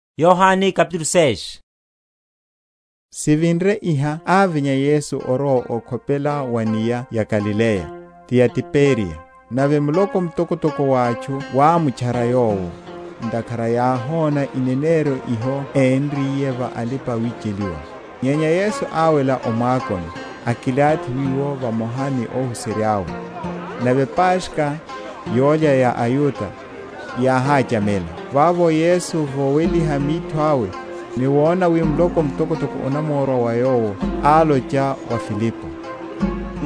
Wachererya ipau. Sivinre iha ávinya Yesu orowa okhopela wa’nia ya Galileya, ti ya Tiberiya. Nave muloko mtokotoko wa atchu wámutchara Yowo, ntakhara yáhona ineneryo hiho énriye va alipa‐wicheliwa. Nyenya Yesu áwela o mwakoni, akilathi wiwo vamoha ni óhuserya’we. Nave Paskha, yólya ya aYuda, yáhachamela. Vavo Yesu, voweliha mitho awe, ni wona wi muloko mtokotoko onamorwa wa Yowo, álocha wa Filipo,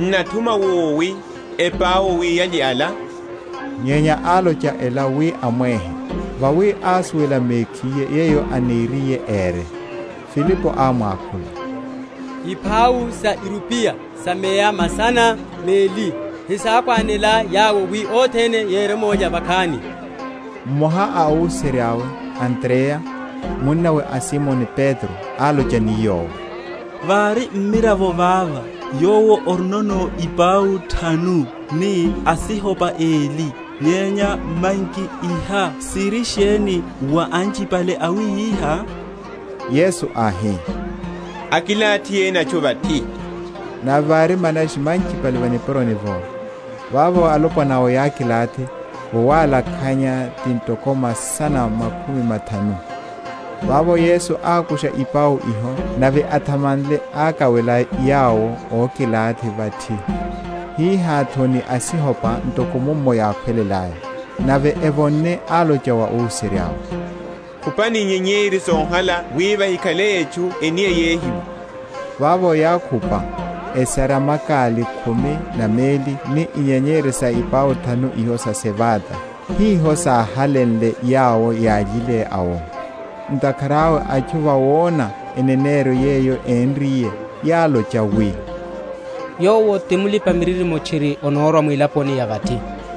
N’nathuma wowi epau wi yalye ala? Nyenya álocha ela wi amwehe; vawi ásuwela mekhiye yeyo aniriye ére. Filipo ámwakhula, Ipau sa irupiya sa meya masana meli hesákhwanela yawo, wi othene yeremolya vakhani. Mmoha a óhuserya’we Andreya, munnawe a Simoni Petro, álocha ni Yowo, Vari mmiravo vava, yowo orinono ipau thanu, ni asihopa eli; nyenya manki iha siri sheni wa anchipale awihiha? Yesu áhi, akilathiheni atchu vathi. Nave vári manashi manchipale va nipuroni’vo. Vavo alopwana’wo yákilathi, vowalakhanya ti ntoko masana makhumi mathanu. Vavo Yesu ákusha ipau iho; nave athamanle, akawela yawo ókilathi vathi; hihá’tho ni asihopa, ntoko mummo yákhwelelaya. Nave evonne, álocha wa óhuserya’we, Khupani inyenyeri sohala wi vahikhale etchu eniyehiwe. Vavo yákhupa, esarya makali khumi na meli ni inyenyeri sa ipau thanu iho sa sevada, hiho sáhalenle yawo yályile awo. Ntakhara awe, atchu, vawona eneneryo yeyo énriye, yálocha wi, Yowo ti mulipa‐miririmo tchiri anorwa mwilaponi ya vathi.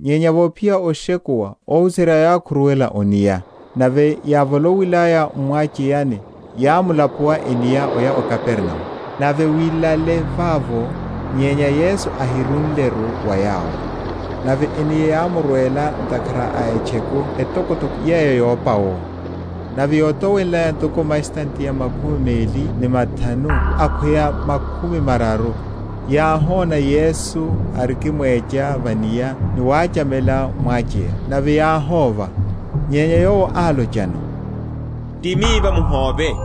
Nyenya vophiya oshekuwa, óhuserya’we yákhuruwela o’nia; nave yávolowilaya m’mwacheyani, yámula?-?puwa enia oya o Kapernaumu. Nave wilale vavo, nyenya Yesu ahirúleru wa yawo. Nave enia yámurwela ntakhara a etcheku etokotoko yeyo yópa’wo. Nave yótowenlaya ntoko mastadiya makhumi meli ni mathanu akhweya makhumi mararu, yáhona Yesu arikimwecha va’nia, ni wachamela mwacheya; nave yáhóva. Nyenya Yowo álochano, Ti miva; muhóve.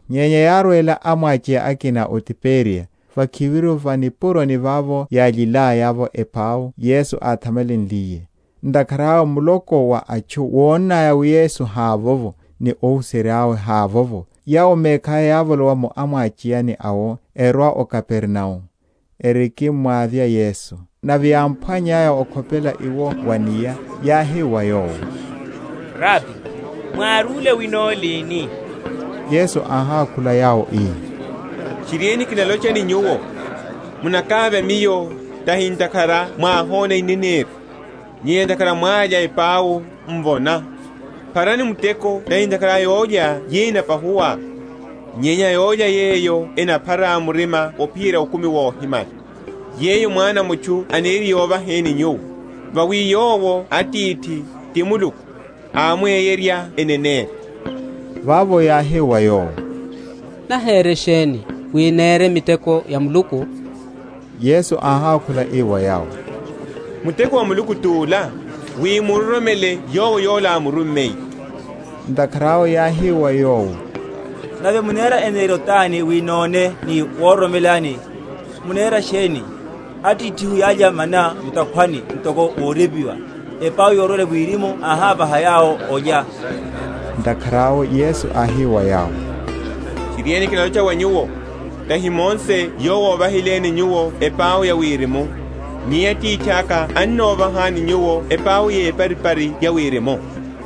nyenya yárwela amwacheya akina o Tiberiya, vakhiviru va nipuroni vavo yályilaya’vo epau Yesu áthamanliye; ntakhara awe muloko wa atchu wonnaya wi Yesu havovo, ni óhuserya’we havovo, yawo mekhaya yávolowa mu amwacheyani awo erwa o Kapernaumu, erikimmwavya Yesu. Nave yámphwannyaya okhopela iwo wa’nia, yáhi wa Yowo, Rabi, mwárúle wenno lini? Yesu áhákhula yawo ii, Tchiriene, kinalocha ni nyuwo, Munakavya Miyo, tahi ntakhara mwáhona ineneryo, nyenya ntakhara mwálya epau, m’vona. Pharani muteko tahi ntakhara a yólya yeyo enapahuwa, nyenya a yólya yeyo enaphara murima ophiyerya okumi wohimala, yeyo Mwana a mutchu aniriye ovaheni nyuwo: vawi yowo Atithi, ti Muluku, ámweyerya eneneryo. Vavo yáhi wa Yowo, Nahere sheni, wi nere miteko ya Muluku? Yesu áhákhula ii wa yawo, Muteko wa Muluku tula, wi muroromele Yowo Yola ámurummiye. Ntakhara awe yáhi wa Yowo, Nave munera eneneryo tani, wi none ni wororomelani? munera sheni? Atithihu yálya mana mu’takhwani; ntoko worepiwa, Epau yorwela wirimu áhávaha yawo olya. Ntakhara awe Yesu áhi wa yawo, Tchiriene, kinalocha wa nyuwo, Tahi Mose yowo óvahileni nyuwo epau ya wirimu; nyenya Atithaka annovahani nyuwo epau yeparipari ya wirimu.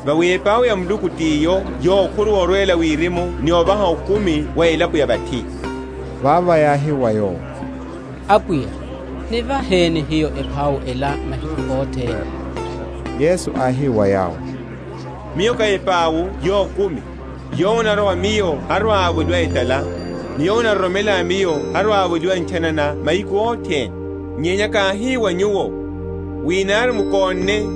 Vawi epau ya Muluku tiyo yokhuruwa orwela wirimu ni ovaha okumi wa elapo ya vathi. Vavo yáhi wa Yowo, Apwiya, Nivaheni hiyo epau ela mahiku othene. Yesu áhi wa yawo, Miyo ká epau yokumi; yowo anarwa wa Miyo harwa‐avoliwa etala, ni yowo anaroromela Miyo harwa‐avoliwa ntchanana mahiku othene. Nyenya káhi wa nyuwo, wi nari mukónne,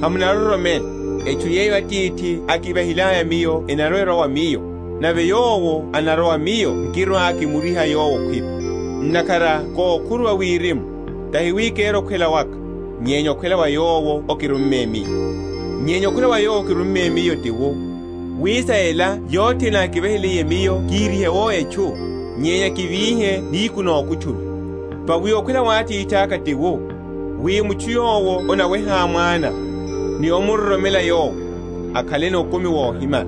hamunaroromela. Etchu yeyo Atithi ákivahiliye Miyo enarwa‐erwa wa Miyo; nave yowo anarwa wa Miyo nkirwa‐kimuriha yowo okhwipi. Ntakhara kókhuruwa wirimu, tahi wi kere okhwela waka, nyenya okhwela wa Yowo ákirumme Miyo. Nyenya okhwela wa Yowo ákirumme Miyo ti wu, wi sa ela yothene ákivahiliye Miyo kihirihe’wo etchu, nyenya kivíhe nihiku nokutchula. Vawi okhwela wa Atithaka ti wu, wi mutchu yowo anaweha Mwana, ni omuroromela Yowo, akhaleno okumi wohimala;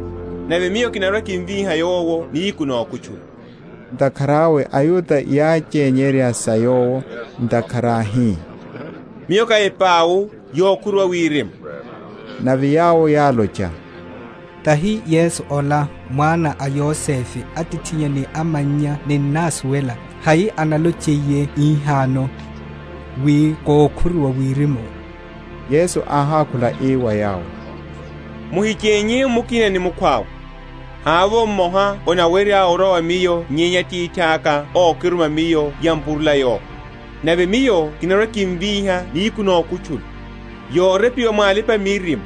nave Miyo kinarwa‐kimvíha yowo nihiku nokutchula. Ntakhara awe aYuda yáchenyerya sa Yowo, ntakhara áhi, Miyo ká epau yokhuruwa wirimu. Nave yawo yálocha, Tahi Yesu ola, mwana a Yosefe, atithinnya ni amannya ninnásuwela? Hai analochiye hihano, wi kókhuruwa wirimu? Yesu áhákhula ii wa yawo, Muhichénye mukina ni mukhwawe. Havovo mmoha anawerya orwa wa Miyo nyenya Atithaka ókiruma Miyo yampurula yowo; nave Miyo kinarwa‐kimvíha nihiku nokutchula. Yorepiwa mwa alipa‐miririmo,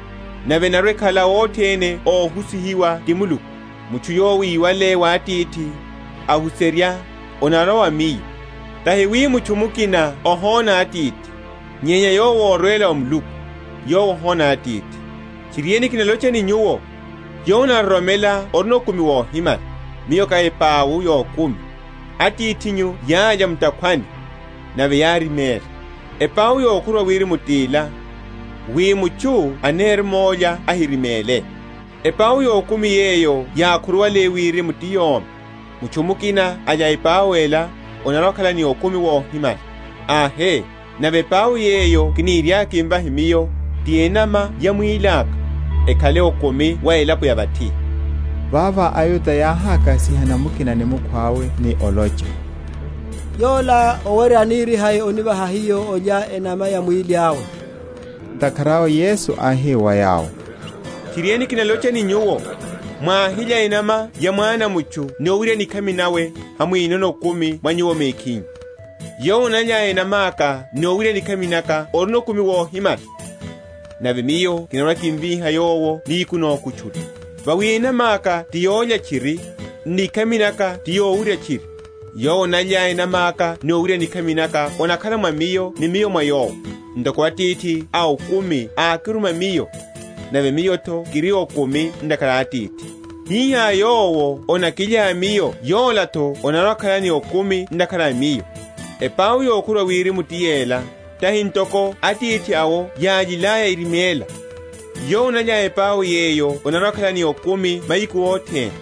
Nave enarwa‐ekhala othene óhusihiwa ti Muluku, Mutchu yowo íwale wa Atithi, ahuserya, annorwa wa Miyo. Tahi wi mutchu mukina ohona Atithi, nyenya Yowo ori órwela wa Muluku, Yowo ohona Atithi. Tchiriene, kinalocha ni nyuwo, Yowo anaroromela orino okumi wohimala. Miyo ká epau yokumi. Atithinyu yálya mu’takhwani, nave yáriméla. Epau yokhuruwa wirimu tila, wi mutchu aneremolya ahiriméle. Epau yokumi yeyo yákhuruwale wirimu, ti yomi. Mutchu mukina alya epau ela, anarwa‐akhala ni okumi wohimala. Ahe, nave epau yeyo kiniriaka kimvahe Miyo, ti enama ya mwíli aka, ekhale okumi wa elapo ya vathi. Vavo aYuda yáhakasihana mukina ni mukhwawe ni olocha, Yola owerya anirihai onivaha hiyo olya enama ya mwíli awe? Ntakhara awe Yesu áhi wa yawo, Tchiriene, kinalocha ni nyuwo, Mwáhilya enama ya Mwana a mutchu ni owurya nikhami nawe, hamwinono okumi mwa nyuwo mekhinyu. Yowo analya enama’ka ni owurya nikhami naka orino okumi wohimala; nave Miyo kinarwa‐kimvíha yowo nihiku nokutchula. Vawi enama’ka ti yólya tchiri, n’nikhami naka ti yowurya tchiri. Yowo analya enama’ka ni owurya nikhami naka anakhala mwa Miyo ni Miyo mwa yowo. Ntoko Atithi a okumi ákiruma Miyo, nave Miyo’tho kiri ni okumi ntakhara a Atithi; hihá yowo anakilya Miyo yola’tho anarwa‐akhala ni okumi ntakhara a Miyo. Epau yokhuruwa wirimu ti yela: tahi ntoko atithi awo yályilaya eriméla: yowo analya epau yeyo anarwa‐akhala ni okumi mahiku othene.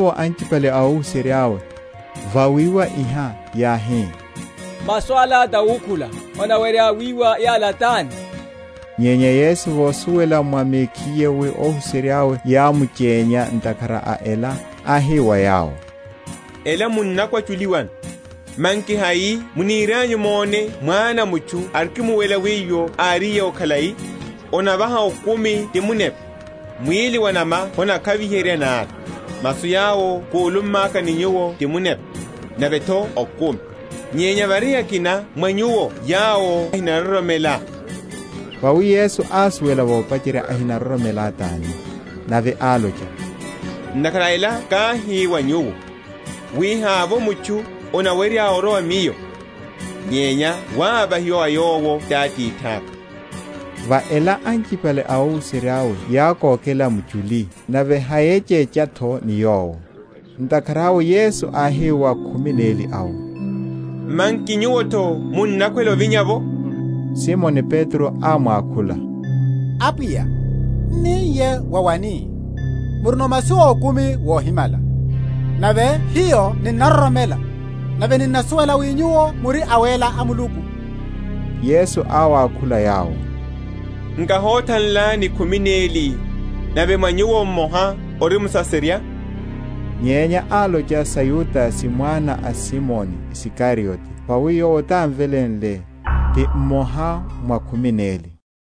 Vavo anchipale a óhuserya’we, vawiwa iha, yáhi, Masu ala tawukhula; anawerya wiwa yala tani? Nyenya Yesu vosuwela mwa mekhiye wi óhuserya’we yámuchenya ntakhara a ela, áhi wa yawo, Ela munnakwachuliwano? Manki hai munirianyu mone Mwana a mutchu arikimuwela wiwo áriye’wo khalai? Onavaha okumi ti munepa; mwíli wa’nama honakhaviherya nari. Masu yawo kúlummaka ni nyuwo ti munepa, nave’tho okumi. Nyenya vari akina mwa nyuwo yawo henaroromela. Vawi Yesu ásuwela vopacherya ahinaroromela tani. Nave álocha, Ntakhara a ela káhi wa nyuwo, wi havovo mutchu anawerya orwa wa Miyo, nyenya wavahiwa wa yowo ti Atithaka. Va ela anchipale a óhuserya’we yákokela muchuli, nave hayéchecha’tho ni Yowo. Ntakhara awe Yesu áhi wa khumi neli awo, Manki nyuwo’tho munnakhwela ovinya’vo? Simoni Petro ámwakhula, Apwiya, n’ni niye wa wani? murino masu ókumi wohimala. Nave hiyo ninnaroromela, nave ninnasuwela wi Nyuwo muri Awéla a Muluku. Yesu áwakhula yawo, Nkáhothanlani khumi neli, nave mwa nyuwo mmoha ori musaserya? Nyenya álocha sa Yudase, mwana a Simoni Isikariote, vawi yowo tanámveléle, ti mmoha mwa khumi neli.